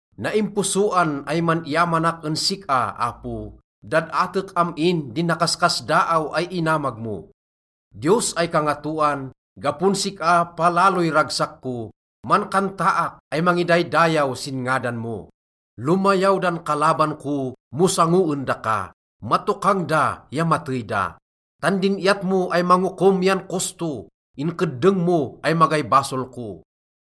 Naimposoan ay man-iyamanak en sik-a, Apo, dad-atek am-in din nakaskasdaaw ay inamag mo. Diyos ay Kangatoan, gapon sik-a palaloy ragsak ko, mankantaak ay mangidaydayaw sin ngadan mo. Lomayaw dan kalaban ko mo sangoen daka, matokang da ya matey da. Tan din iyat mo ay mangokom yan kosto, inkeddeng mo ay magay basol ko.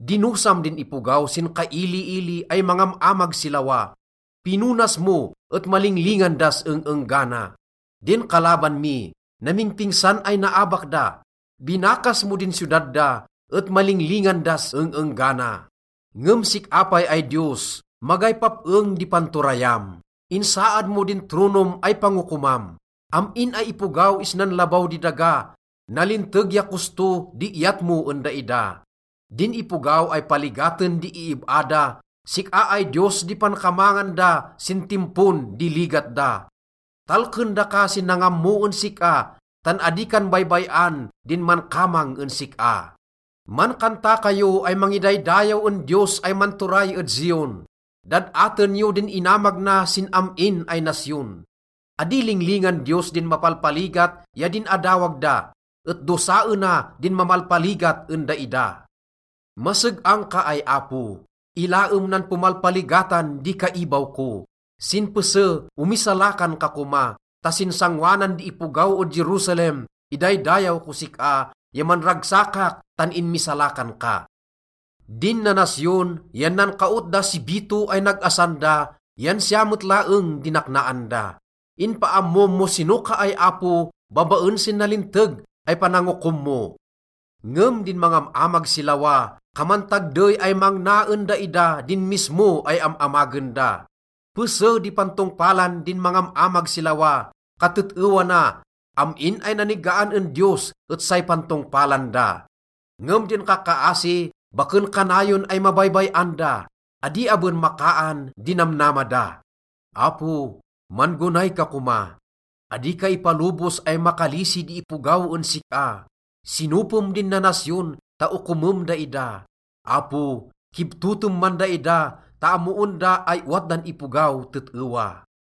Dinosam din ipogaw sin kailiili ay mangam-amag si lawa, pinonas mo et malinglingan das eng-enggana. Din kalaban mi, namingpingsan ay naabak da. Binakas mo din siyodad da, et malinglingan das eng-enggana. Ngem sik-a pay ay Diyos, magay pap-eng di panturayam. Insaad mo din tronom ay pangokomam. Am-in ay ipogaw isnan labaw di daga, Nalinteg ya kosto di iyat mo en daida. Din ipogaw ay paligaten di iib-a da, sik-a ay Diyos di pankamangan da sin timpon di ligat da. Talken daka sin nangammo en sik-a, tan adi kan baybay-an din mankamang en sik-a. Mankanta kayo ay mangidaydayaw en Diyos ay manturay ed Zion. Dad-aten yo din inamag na sin am-in ay nasyon. Adi linglingan Diyos din mapalpaligat ya din adawag da, et dosaena din mamalpaligat en daida. Maseg-ang ka ay Apo, ilaem nan pomalpaligatan di kaibaw ko. Sin pese omisalakan ka koma, ta sin sangoanan di ipogaw ed Jerusalem, idaydayaw kos sik-a ya manragsakak tan inmisalakan ka. Din nanasyon yan nankaot da si bito ay nag-asan da yan siya met laeng di naknaan da. Inpaammom mo sino ka ay Apo babaen sin nalinteg ay panangokom mo. Ngem din mangam-amag si lawa, kaman tagdey ay mangna en daida din mismo ay am-amagen da. Pese di pantongpalan di mangam-amag si lawa. Katet-ewa na, am-in ay nanigaan en Diyos et say pantongpalan da. Ngem din kakkaasi, baken kanayon ay mabaybay-an da, adi aben makaan din namnama da. Apo, man-gonay ka koma, adi ka ipalobos ay makalisi di ipogaw en sik-a. Sinopem din nanasyon ta okomem daida. Apo, kibtotem man daida ta ammoen da ay owat dan ipogaw tet-ewa.